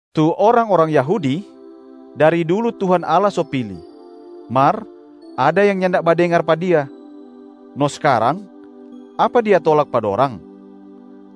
Tu orang-orang Yahudi dari dulu Tuhan Allah so pili, mar ada yang nyanda badengar pa Dia. No skarang, apa Dia tolak pa dorang?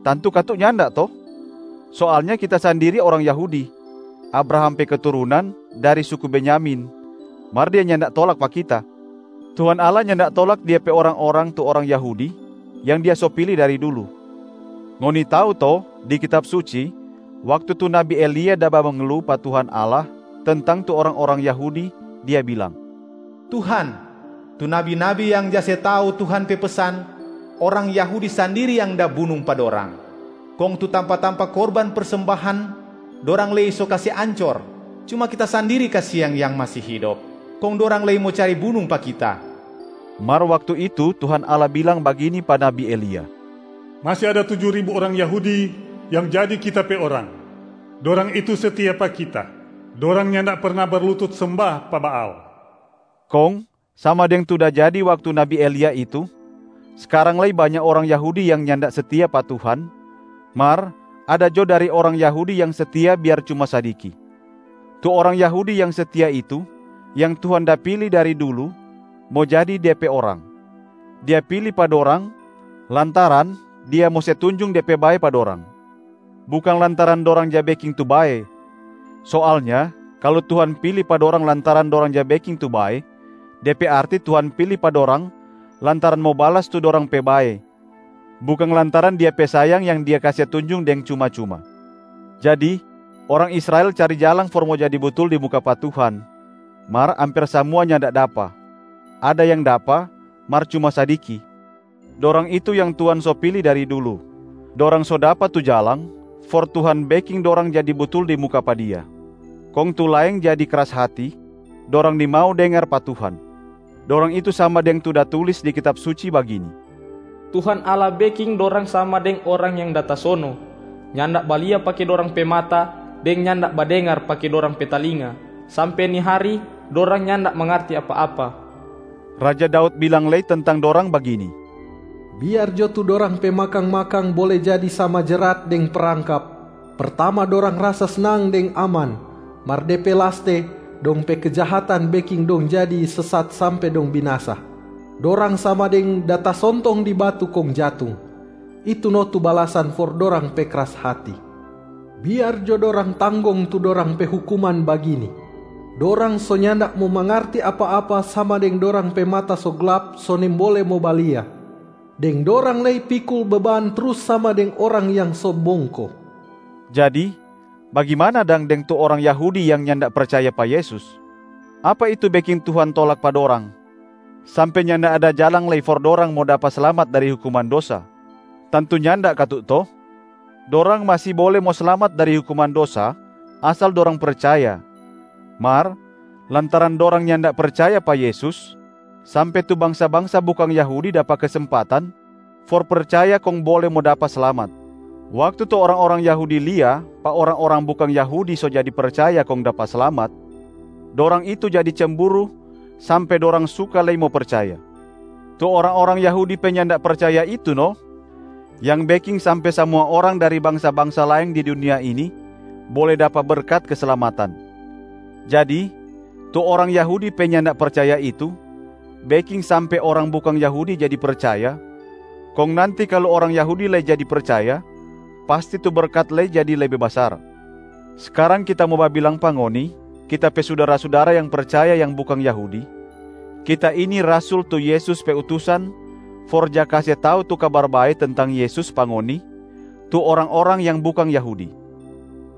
Tantu katu nyanda to? Soalnya kita sandiri orang Yahudi, Abraham pe keturunan, dari suku Benyamin, mar Dia nyanda tolak pa kita. Tuhan Allah nyanda tolak Dia pe orang-orang tu orang Yahudi yang Dia so pili dari dulu. Ngoni tau to di Kitab Suci waktu tu nabi Elia da bamengelu pa Tuhan Allah tentang tu orang-orang Yahudi, dia bilang, “Tuhan, tu nabi-nabi yang ja se tau Tuhan pe pesan, orang Yahudi sandiri yang da bunung pa dorang. Kong tu tampa-tampa korban persembahan dorang lei so kase ancor, cuma kita sandiri kasiang yang masi hidop, kong dorang lei mo cari bunung pa kita.” Mar waktu itu Tuhan Allah bilang bagini pa nabi Elia, “Masi ada tuju ribu orang Yahudi yang jadi Kita pe orang. Dorang itu setia pa Kita, dorang nyanda perna berlutut semba pa Baal.” Kong sama deng tu da jadi waktu nabi Elia itu, skarang lei banya orang Yahudi yang nyanda setia pa Tuhan, mar ada jo dari orang Yahudi yang setia biar cuma sadiki. Tu orang Yahudi yang setia itu yang Tuhan da pili dari dulu mo jadi De pe orang. Dia pili pa dorang lantaran Dia mo se tunjung De pe bae pa dorang, bukang lantaran dorang ja beking tu bae. Soalnya kalu Tuhan pili pa dorang lantaran dorang ja beking tu bae, de pe arti Tuhan pili pa dorang lantaran mo balas tu dorang pe bae, bukang lantaran Dia pe sayang yang Dia kase tunjung deng cuma-cuma. Jadi, orang Israel cari jalang for mo jadi butul di muka pa Tuhan, mar amper samua nyanda dapa. Ada yang dapa, mar cuma sadiki. Dorang itu yang Tuhan so pili dari dulu, dorang so dapa tu jalang for Tuhan beking dorang jadi butul di muka pa Dia. Kong tu laeng jadi kras hati, dorang nimau dengar pa Tuhan. Dorang itu sama deng tu da tulis di Kitab Suci bagini, “Tuhan Allah beking dorang sama deng orang yang da tasono, nyanda balia pake dorang pe mata, deng nyanda badengar pake dorang pe talinga, sampe ni hari dorang nyanda mangarti apa-apa.” Raja Daud bilang lei tentang dorang bagini, “Biar jo tu dorang pe makang-makang bole jadi sama jerat deng prangkap, pertama dorang rasa snang deng aman, mar de pe laste dong pe kejahatan beking dong jadi sesat sampe dong binasa. Dorang sama deng da tasontong di batu kong jatung. Itu no tu balasan for dorang pe kras hati. Biar jo dorang tanggong tu dorang pe hukuman bagini: dorang so nyanda mo mangarti apa-apa sama deng dorang pe mata so glap so nimbole mo balia, deng dorang lei pikul beban trus sama deng orang yang so bongko.” Jadi bagimana dang deng tu orang Yahudi yang nyanda percaya pa Yesus? Apa itu beking Tuhan tolak pa dorang sampe nyanda ada jalang lei for dorang mo dapa slamat dari hukuman dosa? Tantu nyanda katu to? Dorang masi bole mo slamat dari hukuman dosa asal dorang percaya, mar lantaran dorang nyanda percaya pa Yesus sampe tu bangsa-bangsa bukang Yahudi dapa kesempatan for percaya kong bole mo dapa slamat. Waktu tu orang-orang Yahudi lia pa orang-orang bukang Yahudi so jadi percaya kong dapa slamat, dorang itu jadi cemburu sampe dorang suka lei mo percaya. Tu orang-orang Yahudi pe nyanda percaya itu no yang beking sampe samua orang dari bangsa-bangsa laeng di dunia ini bole dapa berkat keslamatan. Jadi tu orang Yahudi pe nyanda percaya itu beking sampe orang bukang Yahudi jadi percaya, kong nanti kalu orang Yahudi lei jadi percaya, pasti tu berkat lei jadi lebe basar. Skarang kita mo babilang pa ngoni, kita pe sudara-sudara yang percaya yang bukang Yahudi: kita ini rasul tu Yesus pe utusan for ja kase tau tu Kabar Bae tentang Yesus pa ngoni tu orang-orang yang bukang Yahudi.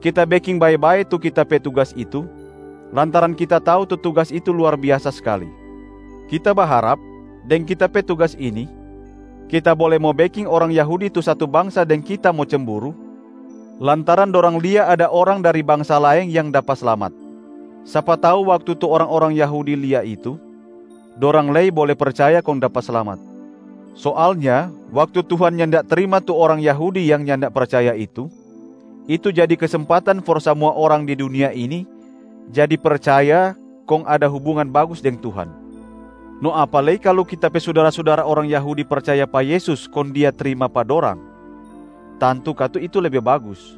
Kita beking bae-bae tu kita pe tugas itu lantaran kita tau tu tugas itu luar biasa skali. Kita baharap deng kita pe tugas ini kita bole mo beking orang Yahudi tu satu bangsa deng kita mo cemburu lantaran dorang lia ada orang dari bangsa laeng yang dapa slamat. Sapa tau waktu tu orang-orang Yahudi lia itu, dorang lei bole percaya kong dapa slamat. Soalnya waktu Tuhan nyanda trima tu orang Yahudi yang nyanda percaya itu, itu jadi kesempatan for samua orang di dunia ini jadi percaya kong ada hubungan bagus deng Tuhan. No apa lei kalu kita pe sudara-sudara orang Yahudi percaya pa Yesus kong Dia trima pa dorang, tantu katu itu lebe bagus.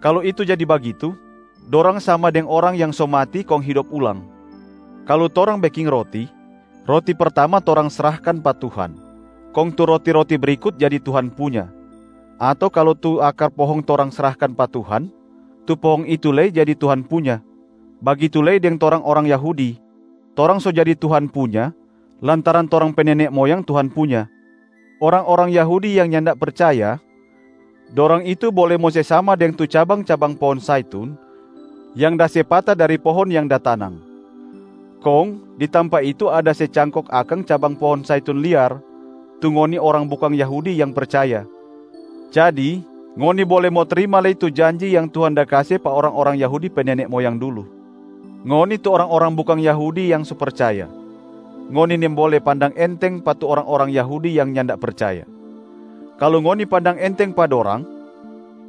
Kalu itu jadi bagitu, dorang sama deng orang yang so mati kong hidop ulang. Kalu torang beking roti, roti pertama torang srahkan pa Tuhan, kong tu roti-roti brikut jadi Tuhan punya. Ato kalu tu akar pohong torang srahkan pa Tuhan, tu pohong itu lei jadi Tuhan punya. Bagitu lei deng torang orang Yahudi, torang so jadi Tuhan punya lantaran torang pe nene moyang Tuhan punya. Orang-orang Yahudi yang nyanda percaya, dorang itu bole mo se sama deng tu cabang-cabang pohong zaitun yang da se pata dari pohong yang da tanang. Kong di tampa itu ada se cangkok akang cabang pohong zaitun liar, tu ngoni orang bukang Yahudi yang percaya. Jadi ngoni bole mo trima lei tu janji yang Tuhan da kase pa orang-orang Yahudi pe nene moyang dulu. Ngoni tu orang-orang bukang Yahudi yang so percaya, ngoni nimbole pandang enteng pa tu orang-orang Yahudi yang nyanda percaya. Kalu ngoni pandang enteng pa dorang,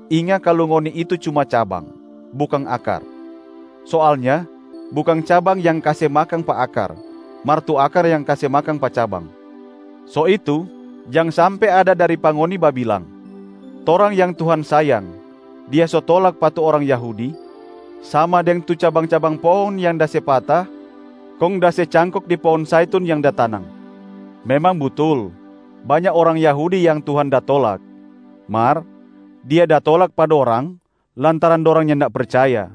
inga kalu ngoni itu cuma cabang, bukang akar. Soalnya bukang cabang yang kase makang pa akar, mar tu akar yang kase makang pa cabang. So itu, jang sampe ada dari pa ngoni babilang, “Torang yang Tuhan sayang, Dia so tolak pa tu orang Yahudi, sama deng tu cabang-cabang pohong yang da se pata kong da se cangkok di pohong zaitun yang da tanang.” Memang butul, banya orang Yahudi yang Tuhan da tolak, mar Dia da tolak pa dorang lantaran dorang nyanda percaya.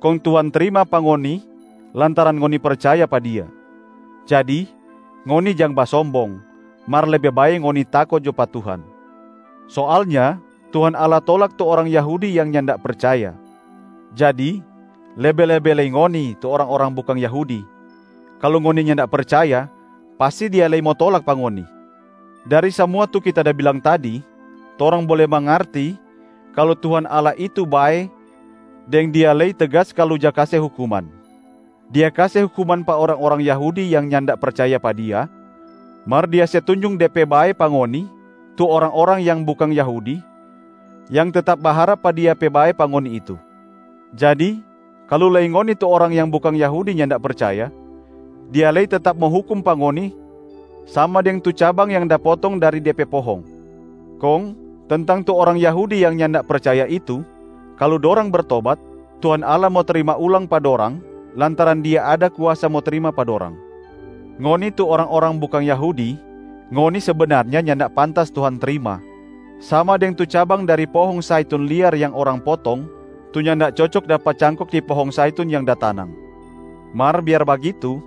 Kong Tuhan trima pa ngoni lantaran ngoni percaya pa Dia. Jadi ngoni jang basombong, mar lebe bae ngoni tako jo pa Tuhan. Soalnya Tuhan Allah tolak tu orang Yahudi yang nyanda percaya. Jadi lebe-lebe lei ngoni tu orang-orang bukang Yahudi, kalu ngoni nyanda percaya pasti Dia lei mo tolak pa ngoni. Dari samua tu kita da bilang tadi, torang bole mangarti kalu Tuhan Allah itu bae deng Dia lei tegas kalu ja kase hukuman. Dia kase hukuman pa orang-orang Yahudi yang nyanda percaya pa Dia, mar Dia se tunjung De pe bae pa ngoni tu orang-orang yang bukang Yahudi yang tetap baharap pa Dia pe bae pa ngoni itu. Jadi kalu lei ngoni tu orang yang bukang Yahudi nyanda percaya, Dia lei tetap mo hukum pa ngoni sama deng tu cabang yang da potong dari de pe pohong. Kong tentang tu orang Yahudi yang nyanda percaya itu, kalu dorang bertobat, Tuhan Allah mo trima ulang pa dorang lantaran Dia ada kuasa mo trima pa dorang. Ngoni tu orang-orang bukang Yahudi, ngoni sebenarnya nyanda pantas Tuhan trima, sama deng tu cabang dari pohong zaitun liar yang orang potong tu nyanda cocok dapa cangkok di pohong Zaitun yang da tanang. Mar biar bagitu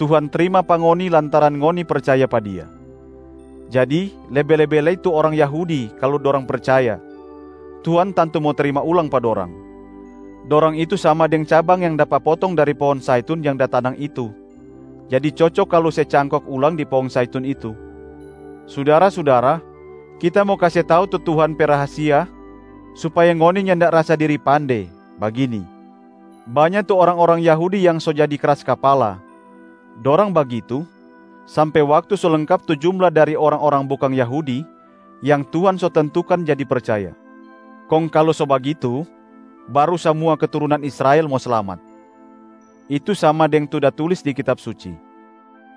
Tuhan trima pa ngoni lantaran ngoni percaya pa Dia. Jadi lebe-lebe lei tu orang Yahudi kalu dorang percaya, Tuhan tantu mo trima ulang pa dorang. Dorang itu sama deng cabang yang dapa potong dari pohong zaitun yang da tanang itu, jadi cocok kalu se cangkok ulang di pohong zaitun itu. Sudara-sudara, kita mo kase tau tu Tuhan pe rahasia supaya ngoni nyanda rasa diri pande, bagini: banya tu orang-orang Yahudi yang so jadi kras kapala. Dorang bagitu sampe waktu so lengkap tu jumla dari orang-orang bukang Yahudi yang Tuhan so tentukan jadi percaya. Kong kalu so bagitu, baru samua keturunan Israel mo slamat. Itu sama deng tu da tulis di Kitab Suci,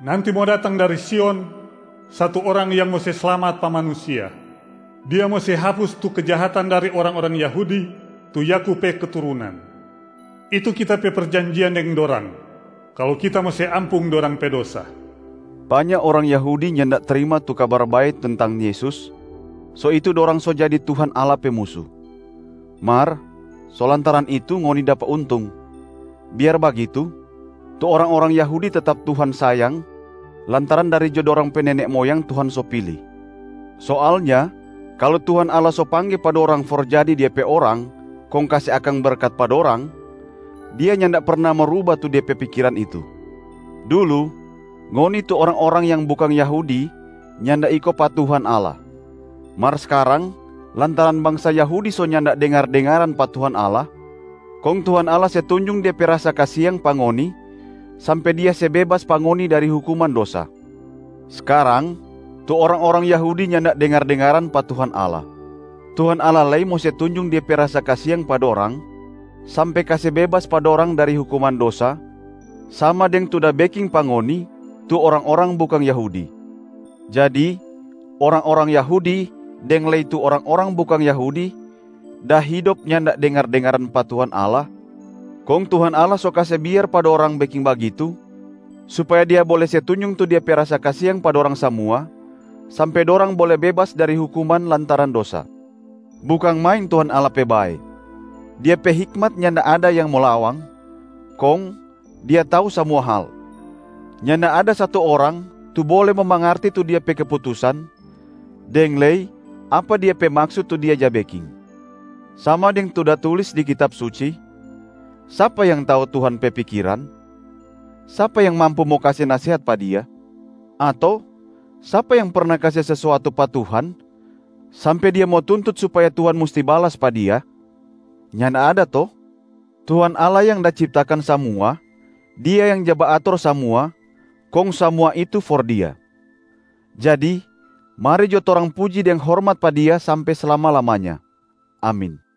“Nanti mo datang dari Sion satu Orang yang mo se slamat pa manusia. Dia mo se hapus tu kejahatan dari orang-orang Yahudi tu Yakub pe keturunan. Itu Kita pe perjanjian deng dorang kalu Kita mo se ampung dorang pe dosa.” Banya orang Yahudi nyanda trima tu Kabar Bae tentang Yesus, so itu dorang so jadi Tuhan Allah pe musu. Mar so lantaran itu ngoni dapa untung. Biar bagitu, tu orang-orang Yahudi tetap Tuhan sayang lantaran dari jo dorang pe nene moyang Tuhan so pili. Soalnya kalu Tuhan Allah so pangge pa dorang for jadi Dia pe orang kong kase akang berkat pa dorang, Dia nyanda perna mo ruba tu De pe pikiran itu. Dulu, ngoni tu orang-orang yang bukang Yahudi nyanda iko pa Tuhan Allah. Mar skarang lantaran bangsa Yahudi so nyanda dengar-dengaran pa Tuhan Allah, kong Tuhan Allah se tunjung De pe rasa kasiang pa ngoni sampe Dia se bebas pa ngoni dari hukuman dosa. Skarang tu orang-orang Yahudi nyanda dengar-dengaran pa Tuhan Allah. Tuhan Allah lei mo se tunjung Dia pe rasa kasiang pa dorang sampe kase bebas pa dorang dari hukuman dosa sama deng tu da beking pa ngoni tu orang-orang bukang Yahudi. Jadi orang-orang Yahudi deng lei tu orang-orang bukang Yahudi da hidop nyanda dengar-dengaran pa Tuhan Allah, kong Tuhan Allah so kase biar pa dorang beking bagitu supaya Dia bole se tunjung tu Dia pe rasa kasiang pa dorang samua sampe dorang bole bebas dari hukuman lantaran dosa. Bukang main Tuhan Allah pe bae. Dia pe hikmat nyanda ada yang mo lawang, kong Dia tau samua hal. Nyanda ada satu orang tu bole mo mangarti tu Dia pe keputusan, deng lei apa Dia pe maksut tu Dia ja beking. Sama deng tu da tatulis di Kitab Suci, Sapa yang tau Tuhan pe pikiran? Sapa yang mampu mo kase nasehat pa Dia? Ato sapa yang perna kase sesuatu pa Tuhan sampe dia mo tuntut supaya Tuhan musti balas pa dia? Nyanda ada to? Tuhan Allah yang da ciptakan samua, Dia yang ja baator samua, kong samua itu for Dia. Jadi mari jo torang puji deng hormat pa Dia sampe slama-lamanya. Amin.